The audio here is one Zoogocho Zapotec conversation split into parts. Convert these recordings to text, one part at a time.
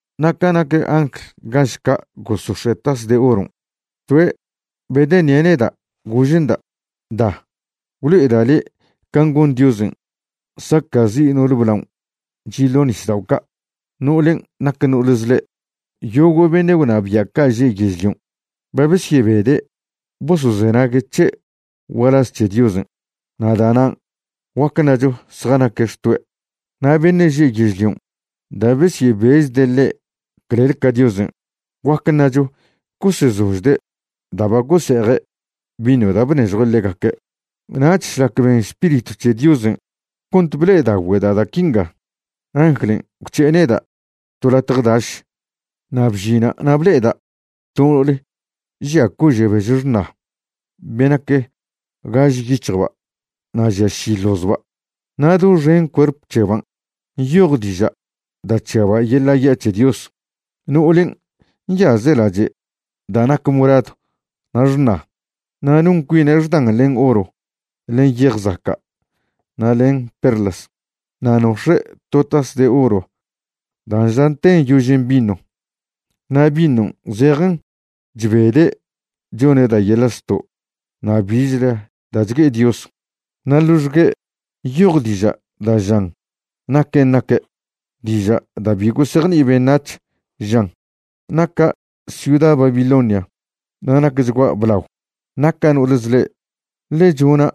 Na' ca nac angl gaž ca' gosox̱e' tas de oron', toe' bedeṉie' neda', gože'nda': ―Da, gwlo'eda' le' can' gon Diosen' saca'zi' no'ole blaon' chi' ḻo nisdao' ca', no'olen' nac no'ol zḻe'. Yogo' beṉe' gwnabia' ca' že' yežlion' ba besyebede' bosozenague' c̱he' gualaz c̱he Diosen', na' da'nan' guac ṉacho zjanaque' xtoe'. Na' beṉe' že' yežlion' da' besyebechde' ḻe' clel ca Diosen', guac ṉacho gosezožde' da' ba gose'eje' vino da' bnežjue' ḻegaque'. Nach šlac ben Spiritw c̱he Diosen' cont ble'edaogüeda' da' quinga, anglen' gwc̱he'e neda' to latje daš. Na' bžina' na' ble'eda' to no'ole žia cože' bež xṉa be nac gaž yic̱hjba' na' žia ši ḻozba'. Na' doxen cuerp c̱heban' nyoj diža' da' chžiaba' yeḻa' ya' c̱he Dios. No'olen' nyaze' lache' da' nac moradw na' xṉa, na' non cuine' xdan len oro, len yej zaca' na' len perlas. Na' nox̱e' to tas de oro da' nža'ten yožen vino. Na' vinon' zejen chbede' chone' da' yeḻa' zto' na' bichle da' chgue'e Dios. Na' ḻoxgue' nyoj diža' da' žan naquen' naque', diža' da' bi gosejni'i beṉac̱h, žan: “Naca' ciuda Babilonia na' nacchgua' blao. Naca' no'ole zḻe', ḻe chona'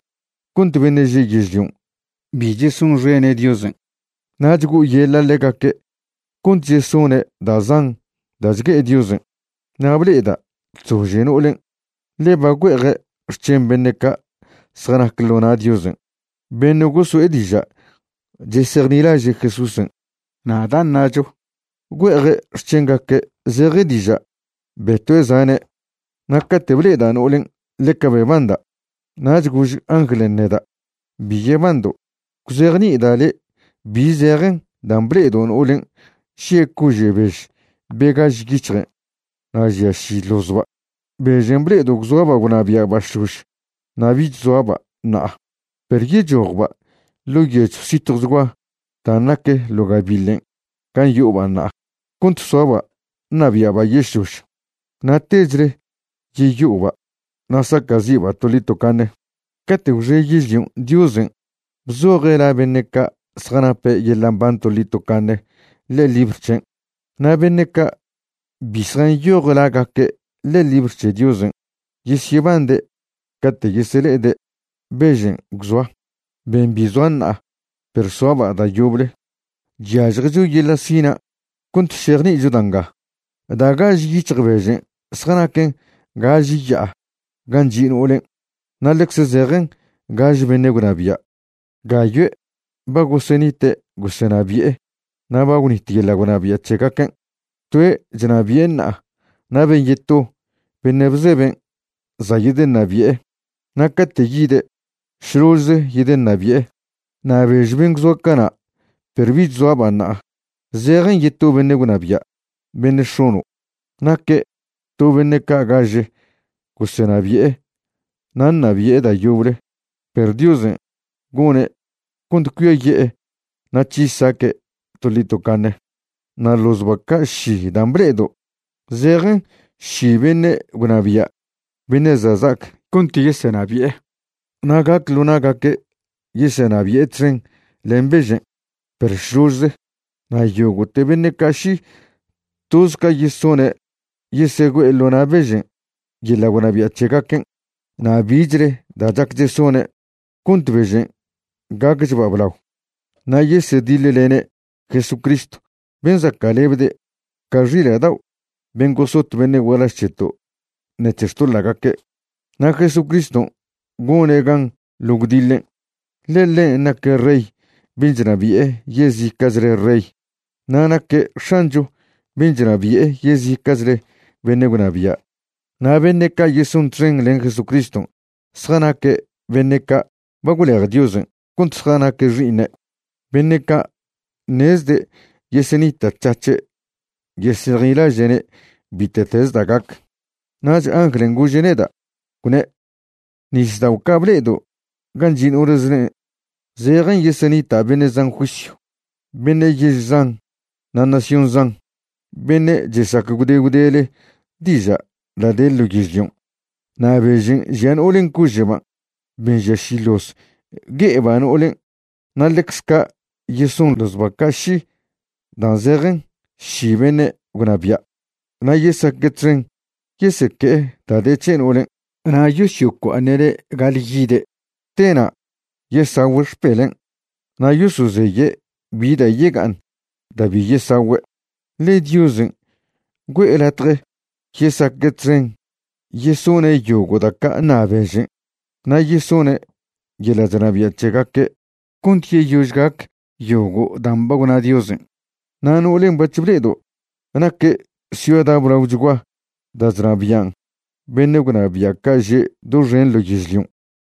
cont beṉe' že' yežlion' bi chesonxene' Diosen', na' chgo'oyeḻa' ḻegaque' cont chesone' da' zan da' chgue'e Diosen'.” Na' ble'eda' chzože no'olen', ḻe ba güe'eje' xc̱hen beṉe' ca' zjanac ḻo na' Diosen', beṉe' goso'e diža' chesejnilaže' Jesúsen', na' da' ṉacho güe'eje' xc̱hengaque' zeje diža' betue' zane'. Na' cate' ble'eda' no'olen' ḻeca bebanda'. Nach gož anglen' neda': ―Bi yebando'. Gwzejni'ida' le' bi zejen dan' ble'edo' no'olen' žie' cože' bež be gaž yic̱hjen' na' žia ši ḻozba'. Bežen' ble'edo' gwzoaba' gwnabia'ba' šlož na' bich zoaba' ṉa'a, perw yechojba' ḻo' yechw zitjwchgua dan' nac ḻo gabiḻen' gan' yo'oba' ṉa'a cont soaba' ṉabia'ba' yežlož, na' techle yeyo'oba' na' saca'zi'ba' toḻi tocaṉe. Cate' gwxe yežlion' Diosen' bzoje' la beṉe' ca' zjanape' yeḻa' mban toḻi tocaṉe ḻe'e libr c̱hen'. Na' beṉe' ca' bi zjanyoj lagaque' ḻe'e libr c̱he Diosen' yesyebande' cate' yesele'ede' bežen' gwzoa, ben' bi zoa ṉa'a perw soaba' da' yoble. ’Chyažjecho yeḻa' sina' cont šejni'icho da' nga: da' gaž yic̱hj bežen' zjanaquen gaž ya'a gan' chi' no'olen'. Na' ḻecze zejen gaž beṉe' gwnabia'. Gayoe' ba gosenite' gosenabi'e na' ba gwnit yeḻa' gwnabia' c̱hegaquen'. Toe' chnabi'e ṉa'a na' ben' yeto beṉe' bzeben' za' yedeṉabi'e, na' cate' yide', šložze yedeṉabi'e. Na' bež ben' gwzoa cana' perw bich zoaba' ṉa'a, zejen yeto beṉe' gwnabia', beṉe' x̱ono'. Naque' to beṉe' ca' gaže gosenabi'e na' ṉabi'e da' yoble, perw Diosen' gone' cont cuiaye'e na' c̱hi saque' toḻi tocaṉe. ’Na' ḻozba' ca' ši dan' ble'edo', zejen ši beṉe' gwnabia' beṉe' za' za'ac cont yesenabi'e. Na' gac ḻo na'gaque' yesenabi'e txen len bežen', perw šložze. Na' yogo'te beṉe' ca' ši, toz ca yesone' yesegüe'e ḻo na' bežen' yeḻa' gwnabia' c̱hegaquen' na' bichle da' chac chesone' cont bežen' gacchba' blao. Na' yesediḻlene' Jesucristw ben' zaca'lebde' ca xila' dao' ben' gosot beṉe' gualaž c̱heto' ṉec̱he xtoḻa'gaque', na' Jesucriston' gone' gan ḻo gwdiḻen', ḻe ḻen' naque' Rey ben' chnabi'e yezica'chle rey, na' naque' X̱ancho ben' chnabi'e yezica'chle beṉe' gwnabia'. Na' beṉe' ca' yeson txen len Jesucriston' zjanaque' beṉe' ca' ba gwlej Diosen' cont zjanaque' xi'iṉe', beṉe' ca' ṉezde' yesenita'c̱hac̱he' yesejnilaže'ne' bite'teze da' gac. Nach anglen' gože' neda', gwne': ―Nisdao' ca' ble'edo' gan' chi' no'ol zḻen' zejen yeseṉita' beṉe' zan juisyw, beṉe' yež zan na' nación zan, beṉe' chesac gwde gwdele diža' da' de ḻo yežlion'. Na' bežen' žia no'olen' cože'ban', ben' žia ši ḻoz, gue'eba' no'olen' na' ḻecz ca' yeson ḻozba' ca' ši dan' zejen ši beṉe' gwnabia'. Na' yesaque' txen yeseque'e da' de c̱he no'olen' na' yosyocua'aṉe'ne' ga'alyide'. Tena' yesagüe' xpelen' na' yosozeye' bi da' yega'aṉ da' bi yesagüe'. Ḻe Diosen' güe'e latje yesaque' txen yesone' yogo' da' ca' ṉa bežen', na' yesone' yeḻa' chnabia' c̱hegaque' ḻo na' bežen' cont yeyož gac yogo' dan' ba gwna Diosen'. Na' no'olen' bac̱h ble'edo', naque' ciuda blaochgua da' chnabian' beṉe' gwnabia' ca' že' doxen ḻo yežlion'.